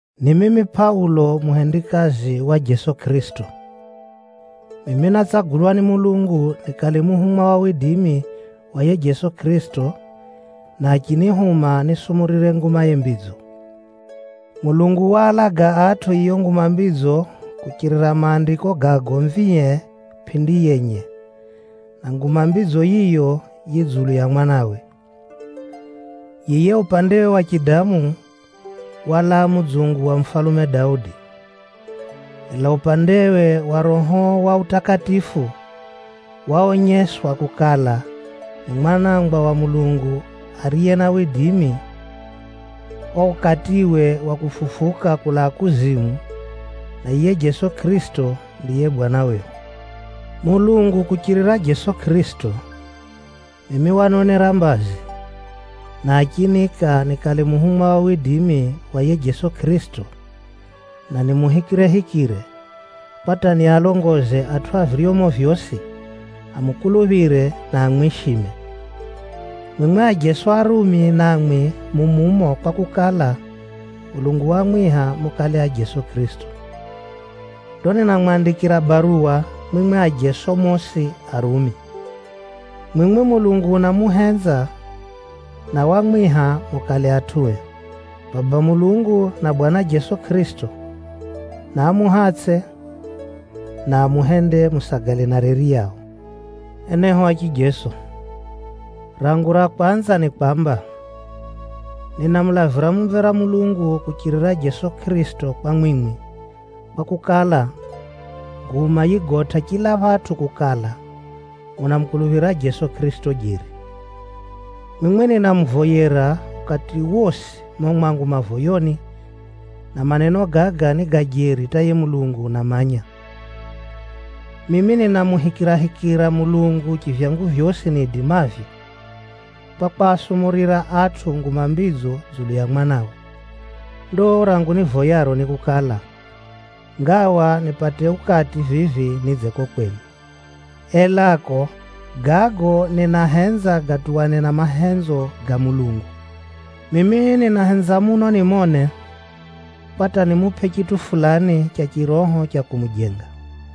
Ni mimi Pʼaulo muhendikazi wa Jeso Kʼirisito. Mimi nátsagulwa ni Mulungu nikale muhumwa wa yiye Jeso Kʼirisito, na achinihuma nisumurire Ngumaye Mbidzo. Mulungu waalaga atʼu yiyo Nguma Mbidzo kuchirira Maandiko ga agomvie pʼindi yenye, na Nguma Mbidzo yiyo yi dzulu ya Mwanawe. Yiye upandewe wa chidamu, walaa mudzungu wa mufalume Daudi. Ela upandewe wa Roho wa utakatifu, waonyeswa kukala, ni Mwanangwa wa Mulungu ariye na widimi, o ukatiwe wa kufufuka kulaa kuzimu, na yiye Jeso Kʼirisito ndiye Bwana wehu. Mulungu kuchirira Jeso Kʼirisito, mimi wanonera mbazi, na achiniika nikale muhumwa wa yiye Jeso Kʼirisito, na nimuhikirehikire, kwa hata nialongoze atʼu a viryomo vyosi amukuluphire, na amwishime. Mwimwi ajeso a Rumi namwi mu mumo kwakukala, Mulungu wamwiha mukale a Jeso Kʼirisito. Ndo ninamwandikira baruwa mwimwi ajeso mosi a Rumi. Mwimwi Mulungu unamuhenza, na wamwiha mukale atʼue. Baba Mulungu na Bwana Jeso Kʼirisito, naamuhatsʼe, na amuhende musagale na reri yao. Enehu a chijeso, rangu ra kwanza ni kwamba, ninamulavira mumvera Mulungu kuchirira Jeso Kʼirisito kwa mwimwi, kwakukala, nguma yigotʼa chila phatʼu kukala, munamukuluphira Jeso Kʼirisito jeri. Mwimwi ninamuvoyera ukati wosi mumo mwangu mavoyoni, na maneno gaga ni ga jeri hata yiye Mulungu unamanya. Mimi ninamuhikirahikira Mulungu chivyangu vyosi niidimavyo, kwa kwasumurira atʼu Nguma Mbidzo dzulu ya Mwanawe. Ndo rangu nivoyaro ni kukala, ngawa nipate ukati vivi nidze kuko kwenu. Elako, gago ninahenza gatuwane na mahenzo ga Mulungu. Mimi ninahenza muno nimone, kwa hata nimupʼe chitʼu fulani cha chiroho cha kumujenga.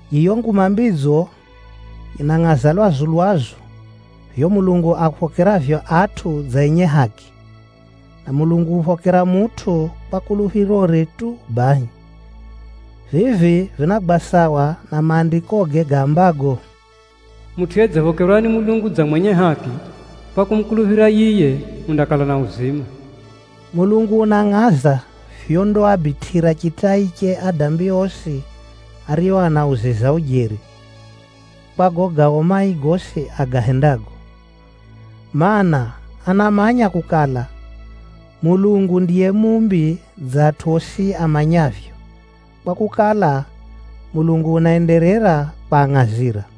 Yiyo Nguma Mbidzo yinangʼaza lwazu-lwazu vivyo Mulungu aphokeravyo atʼu dza enye haki, na Mulungu uphokera mutʼu kwa kuluphirore tu bahi. Vivi vinagwa sawa na Maandikoge gaambago, “Mutʼu yedziphokerwa ni Mulungu dza mwenye haki kwa kumukuluphira yiye, undakala na uzima.” Mulungu unangʼaza vyondaabitʼira chitai adambi osi ario anauziza ujeri, kwa gago gao mai gosi agahendago. Maana, anamanya kukala, Mulungu ndiye muumbi dza atʼu osi amanyavyo, kwakukala, Mulungu unaenderera kwangʼazira.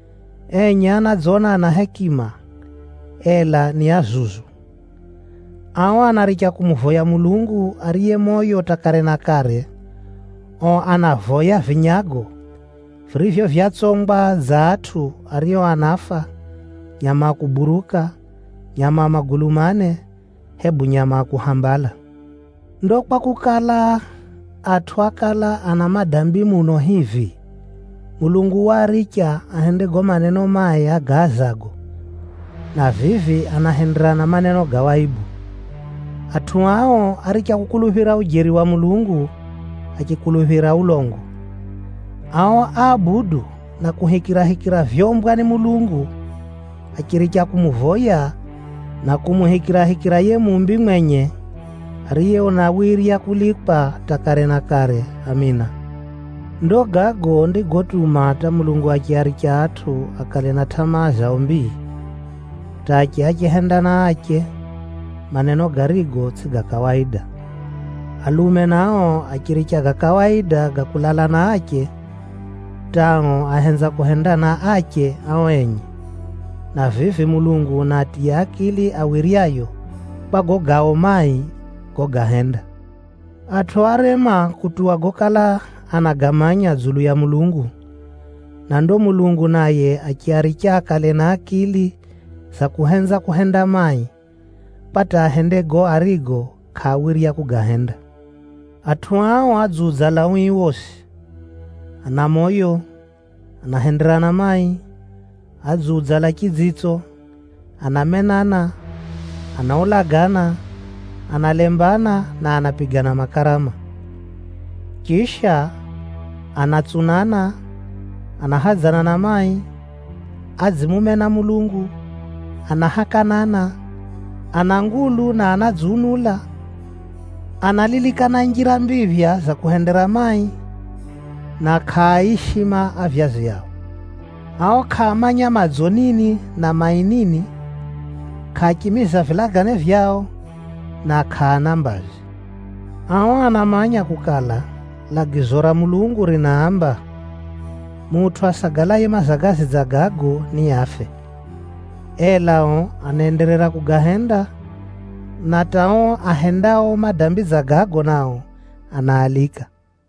Enye anadzona ana hekima, ela ni azuzu. Ao anaricha kumuvoya Mulungu ariye moyo hata kare na kare, ao anavoya vinyago, virivyo vyatsongwa dza atʼu ario anafa, nyama a kuburuka, nyama a magulu mane, hebu nyama a kuhambala. Ndo kwakukala, atʼu ákala ana madambi muno hivi, Mulungu waaricha ahende gago maneno mai agaazago, na vivi anahenderana maneno ga waibu. Atʼu ao áricha kukuluphira ujeri wa Mulungu achikuluphira ulongo. Ao áabudu na kuhikirahikira vyoumbwa ni Mulungu, achiricha kumuvoya na kumuhikirahikira yiye Muumbi mwenye, ariye unawirya kulikwa hata kare na kare! Amina. Ndo gago ndigotuma hata Mulungu achiaricha atʼu akale na tʼamaa zao mbii, hata ache achihendana ache, maneno garigo tsʼigo ga kawaida. Alume nao achiricha ga kawaida ga kulala na ache, hata ao ahenza kuhendana ache ao enye, na vivi Mulungu unaatiya akili awiryayo, kwa gago gao mai gogahenda. Atʼu árema kutuwa gokala anagamanya dzulu ya Mulungu, na ndo Mulungu naye achiaricha akale na akili za kuhenza kuhenda mai, kwa hata ahende gago arigo kʼaawirya kugahenda. Atʼu ao adziudzala ui wosi, ana moyo, anahenderana mai, adziudzala chidzitso, anamenana, anaulagana, analembana, na anapigana makarama. Chisha, anatsunana, anahadzana na mai, adzimumena Mulungu, anahakanana, ana ngulu na anadziunula, analilikana njira mbiphya za kuhendera mai, na kʼaaishima avyazi ao. Ao kʼaamanya madzo nini na mai nini, kʼaachimiza vilagane vyao, na kʼaana mbazi. Ao anamanya kukala, lagizo ra Mulungu rinaamba, mutʼu asagalaye mazagazi dza gago niafe. Ela ao anaenderera kugahenda, na hata ao ahendao madambi dza gago nao, anaalika.